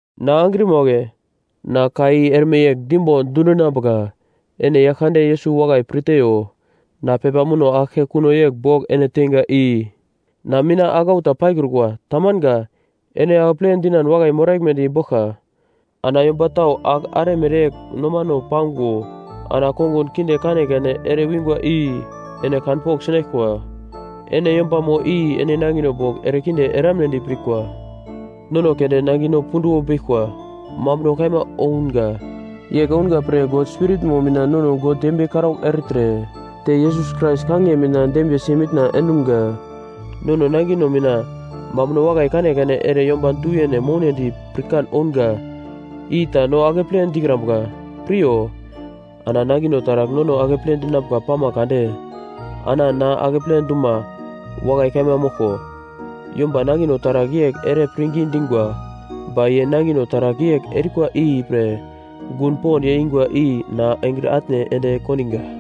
Na angrima wagle, na ka i erme yegl dimbo dundinambuka, ene Yaglkande Yesus wakai pir teiyo. Na pepa muno aglke kuno yegl bogl ene teinga i na mina aglau ta paikrukwa, tamanga, ene akeple dinan wakai moraglmedi boglka. Ana yomba tau agl are mereyegl nomano pango ana kongun kinde kanekane ere wingwa i ene kanpogl sinaglkwa, ene yombamo i ene nangino bogl erekinde eramunedi pirkwa. Nono keunde nangino punduwo beglkwa mambuno kaima ounga. Yegl ounga pre God Spiritmo mina nono God dembiye karaugl ertre te Yesus Krais kangiye mina dembiyesi mitna endumga. Nono nangino mina mambuno wakai kanekane ere yomba du-yene mounedi pirkan ounga i ta no akeple dikrambuka. Piryo, ana nangino taragl nono akeple dinambuka pama kade ana na akeple duma wakai kaima moglko: Yomba nangino taragl yegl ere pirngi dingwa, ba ye nangino taragl yegl erikwa ipre gun pond yeingwa i na engre atne ende kondinga.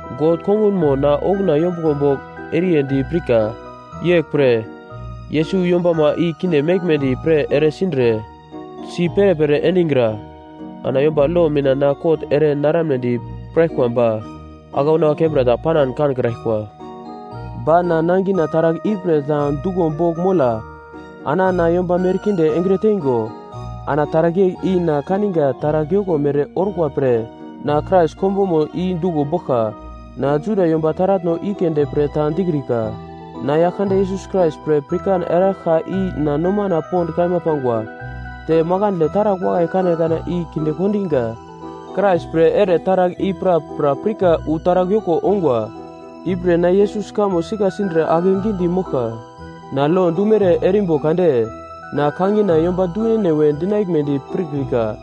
God kongunmo na okuna yombuglo bogl eriyedi pirka, yeglpre Yesus yombama i kinde meglmedi pre eresindre, si perepere endigra. Ana yomba lo mina na kot ere naramnedi piraglkwa ba aglauna kembra ta panan kankraglkwa. Ba na nangina taragl ipre ta duglo bogl mola ana na yomba merkinde engre teingo, ana taragl yegl i na kaninga taragl yoko mere orkwa pre na Krais konbomo i duglo boglka. Na Juda yomba taratno i keunde pre ta dikrika. Na Yaglkande Yesus Krais pre pirkan eraglka i na nomana pond kaima pangwa, te makandle taragl wakai kanekane i kinde kondiga. Krais pre ere taragl i prapra pirka wu taragl yoko ongwa, ipre na Yesus kamo sika sindre akegidi moglka. Na lo dumere erimbo kade na kangina yomba du-yene we dinaglmedi pirkrika.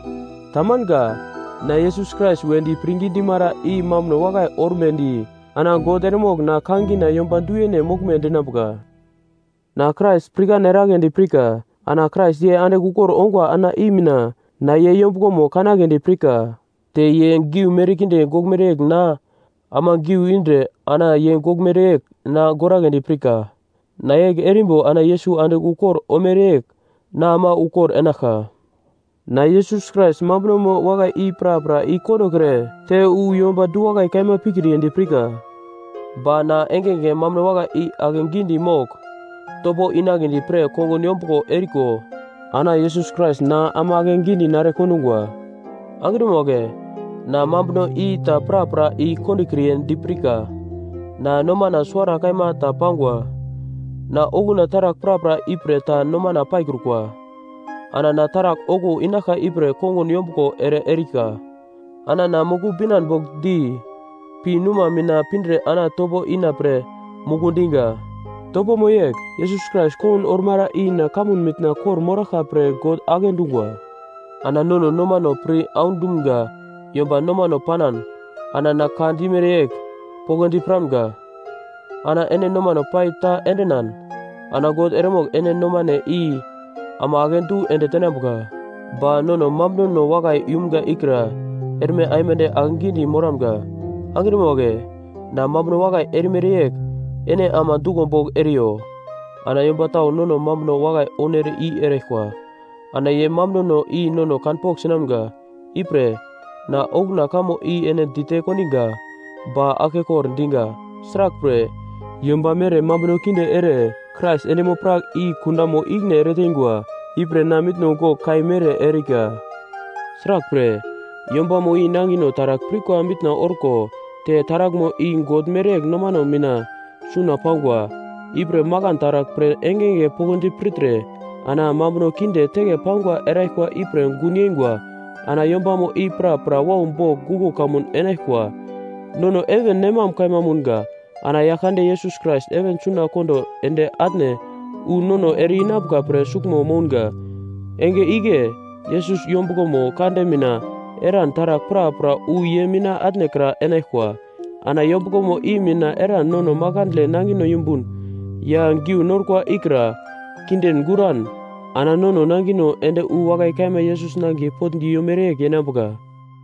Tamanga. Na Yesus Krais wedi pirngi dimara i mambuno wakai ormedi ana God eremogl na kangina yomba du-yene moglme dinambuka. Na Krais pirkan eragledi pirka. Ana Krais ye andigl ukor ongwa ana i mina na ye yombuglomo kanagledi pirka, te ye giu merkinde goglmere yegl na ama giu indre ana ye goglmere yegl na goragledi pirka. Na yegl erimbo ana Yesus andigl ukor omere yegl na ama ukor enaglka. Na Yesus Krais mambunomo wakai i prapra i-kondokre te wu yomba du-wakai kaima pikriyedi pirka. Ba na engenge mambuno wakai i ake gidi mogl topo inagledi pre kongun yombuglo eriko ana Yesus Krais na ama akegidi nare kondungwa. Angrima wagle, na mambuno i ta prapra i-kondokriye dipirka. Na nomana suwara kaima ta pangwa. Na okuna taragl prapra ipre ta nomana paikrukwa. Ana na taragl okuwo inaglka ipre kongun yombuglo ere erika, ana na muku binan bogl di pi numa mina pindre ana topo ina pre muku diga. Topomo yegl, Yesus Krais kongun ormara i na kamun mitna kor-moraglka pre God agle dungwa. Ana nono nomano pir aundumga yomba nomano panan ana na ka dimere yegl poglodi piramga. Ana ene nomano pai ta endinan ana God eremogl ene nomane i ama akedu ende tenambuka. Ba nono mambunono wakai yumga ikra erme aimande akegidi moramga. Angrima wagle, na mambuno wakai erimere yegl ene ama duglo bogl eriyo. Ana yomba tau nono mambuno wakai ounere i eraglkwa, ana ye mambunono i nono kanpogl sinamga. Ipre, na okuna kamo i ene dite kondiga ba aglkekor diga, sraglpre, yomba mere mambuno kinde ere Krais endimo-prak i kundamo ikine ereteingwa, ipre na mitno gogl kai mere erika. Sraglpre, yombamo i nangino taragl pirkwa mitna orko te taraglmo i God mereyegl nomano mina suna pangwa, ipre makan taragl pre engenge poglodi pirtre ana mambuno kinde teke pangwa eraglkwa ipre gun yeingwa ana yombamo i prapra wau bogl guglo kamun enaglkwa. Nono heven nem mam kaima mounga. Ana Yaglkande Yesus Krais heven suna kondo ende atne wu nono ere-inambuka pre suglmo mounga. Enge igle, Yesus yombuglomo kande mina eran taragl prapra wu ye mina atnekra enaglkwa, ana yombuglomo i mina eran nono makandle nangino yumbun ya giu norkwa ikra kindin-guran ana nono nangino ende wu wakai kaima Yesus nangiye potndi yomere yegl yenambuka.